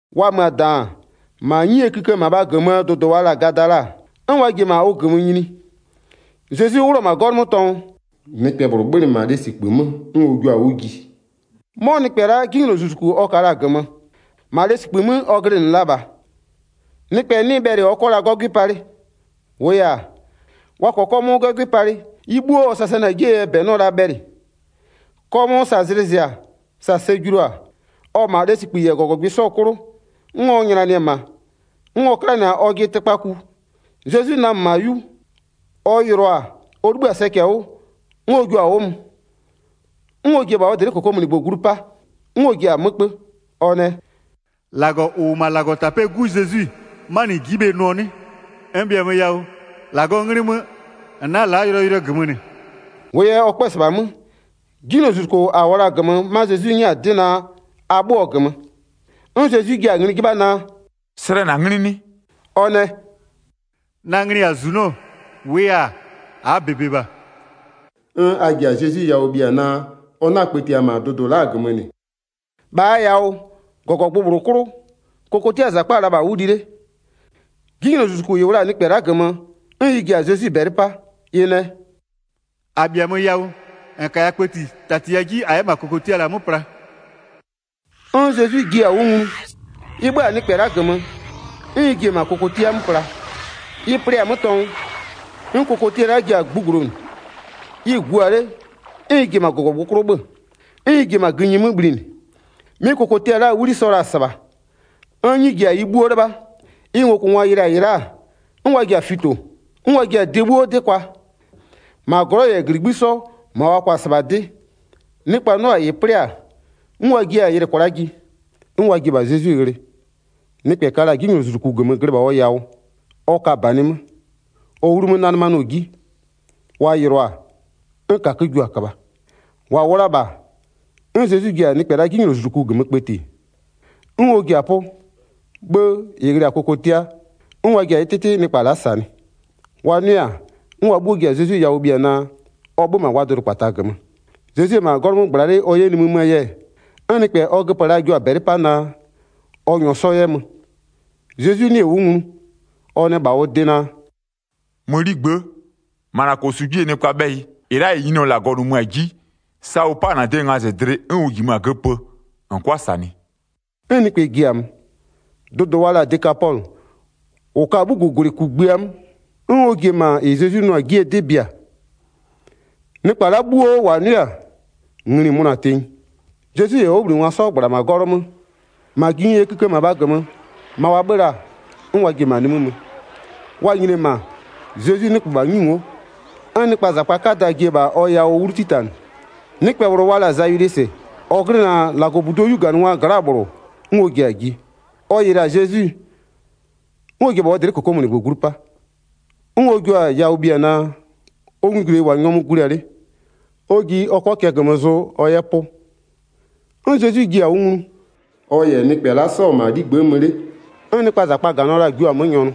Wa mö-a -daan, -ma 'nyie kïkë -mabha -gömöö dʋdʋ wa la-a Gadala, 'n wa ji-e -ma ʋ -gömö nyini. Zezwi 'wlʋ-ɔ -ma 'gɔlʋ 'mö tɔngʋ, nɩkpɛ -bhlʋ 'bhönɩ -ma lesikpï 'mö, 'n ɔ jio-a 'wʋ ji. 'Mɔ nɩkpɛ la'a 'jinylozuzuku ɔ ka la-a -gömö. 3-Ma lesikpï 'mö ɔ glɩnɩ la -bha. Nɩkpɛ 'nɩ bhɛlɩ ɔ 'kɔ la 'gɔgwɩ palɩ. 4-Wʋʋ yɛ-a, wa -kɔɔ 'kɔmʋʋ 'gɔgwɩ palɩ, ɩ 'bhuo ɔ sasanɩ-a 'jie yɛ -bɛ 'nɩɔ la bhɛlɩ. 'Kɔmʋʋ sa zlɩ zɩ-a, sa sɛ julu-a, ɔ-ɔ -ma lesikpï -yɛ -gɔgɔgbɩ 'sɔ 'klʋ, 'n ɔ nylanɩ-ɛ -ma, 'n ɔ 'klanɩ-a ɔjɩ tɩkpaku. Zezwi namö -ma 'yu, ɔ yɩlɩɔ-a, ɔ 'libhï-a sɛcɛ 'wʋ, 'n ɔ jio-a 'wʋ mö, 'n ɔ ji-e -bha ɔ dlɩ'ɩ -kokomunigbö glu 'pa. 'N ɔ ji-a 'mö 'kpö, ɔ nɛ: “-Lagɔ -ʋ -wʋ -ma -Lagɔtapɛ'ɛɛ 'Gu Zezwi, 'manɩ -n ji'i bhe nʋɔ 'nɩ? N -bhiamö yawʋ, -Lagɔɔ 'nglɩ 'mö, -n 'na-a la'a yʋlɔyʋlʋɛ -gömö -nɩ.” 8-Wʋʋ yɛ ɔ 'kpö-ö -sɩbha 'mö, 'jinylozuzuko -a -wʋɔ la-a -gömö 'ma Zezwi 'nyɛ-a 'dɩ naa, a 'bhö-öɔ -gömö. 'N Zezwi jia-a ngli 'jɩbha naa: “Slɛ -na 'nglɩ 'nɩ?” A nɛ: “Na nglɩ -yɛ-a -zunɔ, -wʋʋ yɛ-a, -aa -bebe -bha.” 'N a ji-a Zezwi yawʋ bhia naa, ɔ 'na-a kpëtiɩ -ma dʋdʋ la'a -gömö -nɩ. 11-Bhaa yawʋ, -gɔgɔgbʋ -bhlʋ 'klʋ, kokotiaa -zakpa-a la -bha 'wʋ li 'le. 'Jinylozuzuku -ɩ -wʋ la-a nɩkpɛ la'a -gömö, 'n ɩ ji-a Zezwi -bɛlɩ 'pa, ɩ nɛ: “-A -bhiamö yawʋ, -n -kaya kpëti, -tatiya 'ji -a 'yɛ -ma kokotia -la 'mö pla.” 'N Zezwi jiɩ-a 'wʋ nglu, ɩ 'bhö-a nɩkpɛ la'a -gömö 'n ɩ ji-e -ma kokotia 'mö pla. Ɩ plɩ-a 'mö tɔngʋ, 'n kokotia la'a ji-a gbugblonʋ, ɩ-ɩ gua 'le 'n ɩ ji-e -ma -gɔgɔgbʋ 'klʋ 'bhö-ö, 'n ɩ ji-e -ma gïnyi 'mö bhlinɩ. 'Mɩ kokotia la'aa 'wli sɔ la-a -sɩbha. 'N 'nyi ji-a ɩ 'bhuo 'lɩbha. Ɩ ngokʋngwa yɩlɩ-a -ɩ la'a, 'n wa ji-a fito, 'n wa ji-a de 'bhuo 'dɩ kwa, -ma glɔ'ɔ -yɛ -gligbï'ï 'sɔ -ma wa kwa-a -sɩbha 'dɩ. Nɩkpa 'nʋ-a -ɩ 'plɩ-a, 'n wa jiɩ-a yɩlɩ kwla'a ji. 'N wa ji-e -bha Zezwi ghlɩ, nɩkpɛ ka la-a 'jinylozuzuku -gömö glɩ -bha ɔ yawʋ, ɔ ka -banɩ 'mö, ɔ 'wlu 'mö 'nanɩmanɩɔ 'ji. Wa yɩlɩɔ-a, 'n -kakö jua-a köbha. 16-Wa -wʋ la-a -bha 'n Zezwi ji-a nɩkpɛ la'a 'jinylozuzuku -gömö kpëti, 'n ɔ ji-a 'pʋ, 'bhë -ɩ ghlɩ-a kokotia, 'n wa ji-a ɩ 'tɩtɩ nɩkpa la'a -sanɩ. Wa 'nʋɩ-a, 'n wa 'bhuo ji-a Zezwi yawʋ bhia naa, ɔ 'bhö-ö -ma wa dʋdʋkpata -gömö. Zezwi-e -ma 'gɔlʋ 'mö -gbla 'le ɔ 'yɛ nimï möö yɛ, 'n nɩkpɛ -ɔ ɔ göpö la-a jio-a -bɛlɩ 'pa naa, ɔ -nyɔɔ 'sɔ 'yɛ mö. Zezwi 'nɩɩ-ɩ 'wʋ nglu, ɔ nɛ -bha ɔ de naa: “Mö 'ligbë'ë, -ma -na -kosu 'jie nɩkpaa 'bhɛyɩ, -ɩ la'a -ɩ Nyininyɔ -Lagɔ -nʋmö-a 'ji, sa ʋ 'pa-a -na de ngazɩdlɩ, 'n ʋ -jimö-a göpö -n 'kʋa -sanɩ.” 'N nɩkpɛ ji-a mö. Dʋdʋ wa la-a Dekapɔlʋ -ʋ ka-a 'bhugugwlɩ kugbïa 'mö, 'n ɔ ji-e -ma -ɩ Zezwi nʋɔ-a 'jie 'dɩ bia. Nɩkpa la'a 'bhuo -wa 'nʋɩ-a, ngli-i mönʋa-a tenyi. Zezwi -yɛ ɔ 'wʋbhlinɩngwa 'sɔ -gbla-a -ma 'gɔlʋ 'mö, -ma gïnyie kïkë -mabha -gömö, ma wa 'bhö-ö la-a, 'n wa ji-e -ma nimï mö. Wa nyini-e -ma, Zezwi 'nɩgbö -bha 'nyi ngo'o, 'n nɩkpaa -zakpa 'kada ji-e -bha ɔ yawʋ 'wlu 'titanɩ. Nɩkpɛ -bhlʋ wa la-a Zayilwisɩ, -ɔ glɩnɩ-a -Lagɔbuduo 'yuganɩngwaa gla'aa -bhlʋ, 'n ɔ ji-a ji. Ɔ yɩlɩ-a Zezwi, 'n ɔ ji-e -bha ɔ dlɩ'ɩ -kokomunigbö glu 'pa. 'N ɔ jio-a yawʋ bhia naa, ɔ nglugwileyi -wʋ-a nyɔmʋ gulia 'le, ɔ ji ɔ 'kɔ cɛ -gömö zʋ ɔ 'yɛ 'pʋ. 'N Zezwi jiɩ-a 'wʋ nglu, ɔ -yɛ nɩkpɛ la'a 'sɔ-ɔ -ma ɔ 'ligbë'ë mö 'le, 'n nɩkpaa -zakpa-a -ganɩɔ la-a jio-a 'mö nyɔnʋ.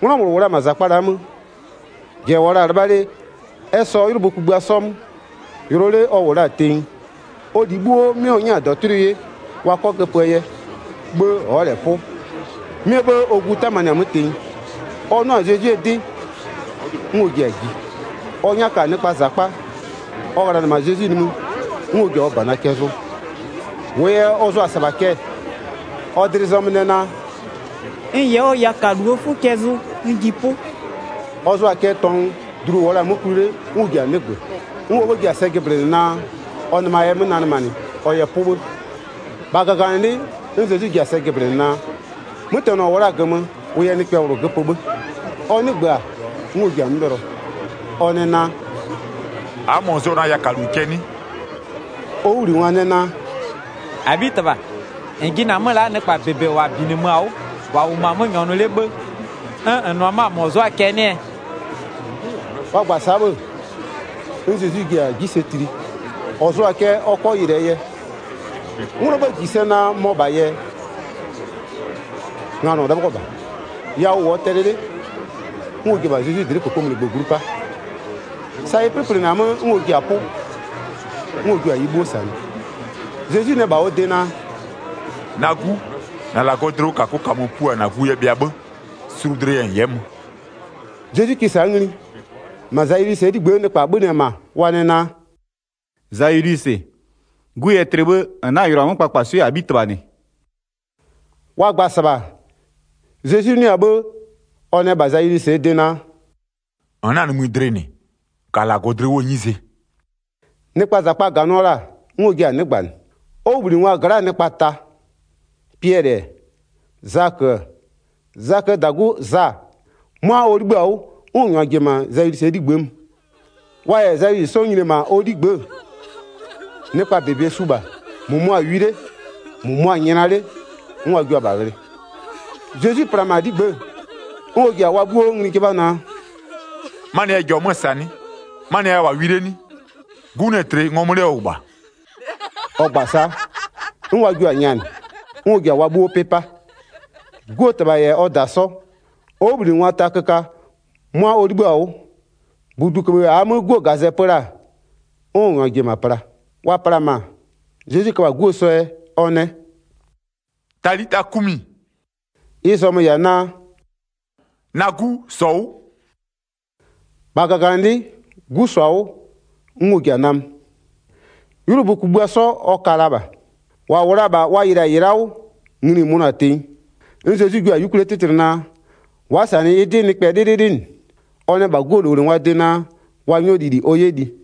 'Nglɔ -bhlʋ -wʋ la-a -ma -zakpa la'a 'mö, -jɛ -wʋɔ la-a 'lɩbha 'le, ɛ -sɔɔ 'ylʋbö kugbïa 'sɔ 'mö. Yʋlɔ 'le ɔ -wʋ la-a tenyi, ɔ -li 'bhuo 'mɩ ɔ 'nyɛ-a -dɔtʋlʋɩ 'ye wa 'kɔ göpöö yɛ, 'bhë ɔ'ɔ -lɛ 'pʋ. 'Mɩɛ 'bhë ɔ gu 'tamanɩ-a 'mö tenyi. Ɔ 'nʋ-a Zezwie 'dɩ, 'n ɔ ji-a ji, ɔ 'nyaka-a nɩkpaa -zakpa, ɔ ghlanɩ-ɛ -ma Zezwi nimï, 'n ɔ ji-a ɔ -bana cɛ zʋ. 28-Wʋʋ yɛ ɔ zʋa-a -sɩbha cɛ-ɛ, ɔ dlɩ zɔmö nɛ naa: “N -yɛ ɔ yakaluo 'fʋ cɛ zʋ, n ji 'pʋ.” Ɔ zʋa-a cɛ tɔngʋ, dlu -ʋ -wʋɔ la-a 'mö kwli 'le 'n ʋ ji-a 'nɩgbö. 'N ɔ 'bhë ji-a sɛ jɩblɩnɩ naa, ɔ nɩma yɛ 'mö nanɩmanɩ ɔ yɛ 'pʋ 'bhë. 30-Bha -gaganɩlɩ'ɩ 'n Zezwi ji-a sɛ jɩblɩnɩ naa, 'mötɛnɔ -ʋ -wʋɔ-a -gömö, ʋ yɛ nɩkpɛ -bhlʋ göpö 'bhë. Ɔ 'nɩgbö-a, 'n ɔ ji-a 'mö 'bhɩlɔ, ɔ nɛ naa: “A'a -mɔ zʋ-ɔ na yakalu cɛ 'nɩ?” Ɔ 'wʋbhlinɩngwa nɛ naa: “-Abhitɩbha, -n jɩnɩ-a 'mö la'a nɩkpa -bebe -wa -binɩmö-a 'wʋ, wa -wʋmö-a 'mö nyɔnʋ 'le 'bhë-ë, 'n -n nʋ-ɔ 'mö-a -ɔ zʋ'ʋ-a cɛ 'nɩɛ?” Wa gba-a sa'a 'bhë-ë, 'n Zezwi ji-a 'ji sɛ tli -ɔ zʋɔ-a cɛ ɔ 'kɔ yɩlɩɛ yɛ. 'Nglɔɔ 'bhë -ji sɛ naa mɔ -bhaa yɛ, nganɔ 'lɩbhɔ -bha. Yawʋ -wʋɔ tɛlɩ 'le, 'n ɔ ji-e -bha Zezwi dlɩ'ɩ -kokomunigbö glu 'pa, sa ɩ 'plɩplɩnɩ-a 'mö 'n ɔ ji-a 'pʋ, 'n ɔ jio-a ɩ 'bhuo -sanɩ. Zezwi nɛ -bha ɔ de naa: “Na 'gu, -na -Lagɔɔ dlɩwʋkakʋ -kamö pua -na gu yɛ bhɩa 'bhë, sulu dlɩ yɛ -n 'yɛ mö.” Zezwi kɩ sa'a ngli, -ma Zayilwisɩɛ 'ligbë'ë nɩkpa 'bhönɩ-ɛ -ma wa nɛ naa: “Zayilwisɩ, 'gu yɛ tlɩ 'bhë -n 'na-a yʋlʋa 'mö kpakpaswɩ'ɩ -Abhitɩbha -nɩ.” Wa gba-a -sɩbha Zezwi 'nʋɩ-a 'bhë, ɔ nɛ -bha Zayilwisɩɛ de naa: “-N 'na-a nimï dlɩ -nɩ, -ka -Lagɔ dlɩ 'wʋɔ 'nyize.” Nɩkpaa -zakpa -ganɩɔ la-a, 'n ɔ jia-a 'nɩgbanɩ. Ɔ 'wʋbhlinɩngwa gla'aa nɩkpa ta, Piɛlɩ-ɛ, Zakö-ö, Zaköö -dagu Za, 'mʋa ɔ 'libhï-a 'wʋ 'n ɔ -nyʋa ji-e -ma Zayilwisɩɛ 'ligbë'ë mö. Wa -yɛ Zayilwisɩ 'sɔ nyini-e -ma ɔ 'ligbë'ë, nɩkpaa -bebe su -bha, -mʋmʋa-a wi 'le, -mʋmʋa-a nyla 'le 'n wa jua-a -bha ghlɩ. Zezwi pla-a -ma 'ligbë'ë, 'n ɔ ji-a wa 'bhuo ngli 'jɩbha naa: “'Manɩɛ jɔ-ɔ 'mö-ö -sa 'nɩ? 'Manɩɛ yɛ a -wʋ-a wi 'le 'nɩ? 'Gu 'nɩ-ɛ tlɩ, ngɔmö 'le ɔ -wʋ -bha.” Ɔ gba-a sa'a, 'n wa jio-a nyanɩ. 'N ɔ ji-a wa 'bhuo 'pɩ 'pa. 'Guo -tɩbha -yɛ ɔ -da 'sɔ, ɔ 'wʋbhlinɩngwa ta köka, 'mʋa ɔ 'libhï-a 'wʋ, -buduköbhë -aa 'mö 'guo -gazɛ pö la-a, 'n ɔ -nyʋa ji-e -ma pla. Wa pla-a -ma, Zezwi köbha-a 'guo sɔ yɛ, ɔ nɛ: “Talita kumi!” Ɩ zɔmö-ö -yɛ-a naa: “Na 'gu, -sɔ 'wʋ!” 42-Bha -gaganɩlɩ'ɩ, 'gu -sɔ-a 'wʋ 'n ɔ ji-a namö. 'Ylʋbö kugbïa 'sɔ ɔ ka la -bha, -wa -wʋ la-a -bha wa yɩlɩ-a -ɩ la'a 'wʋ, ngli-i mönʋa-a tenyi. 'N Zezwi jua-a 'yukwlie 'tɩtlɩ naa, wa'a -sanɩ ɩ 'dɩ nɩkpɛ 'lɩlɩlɩ -nɩ. Ɔ nɛ -bha 'guo -lowlengwaa de naa, wa 'nyɔ lili ɔ 'yɛ li.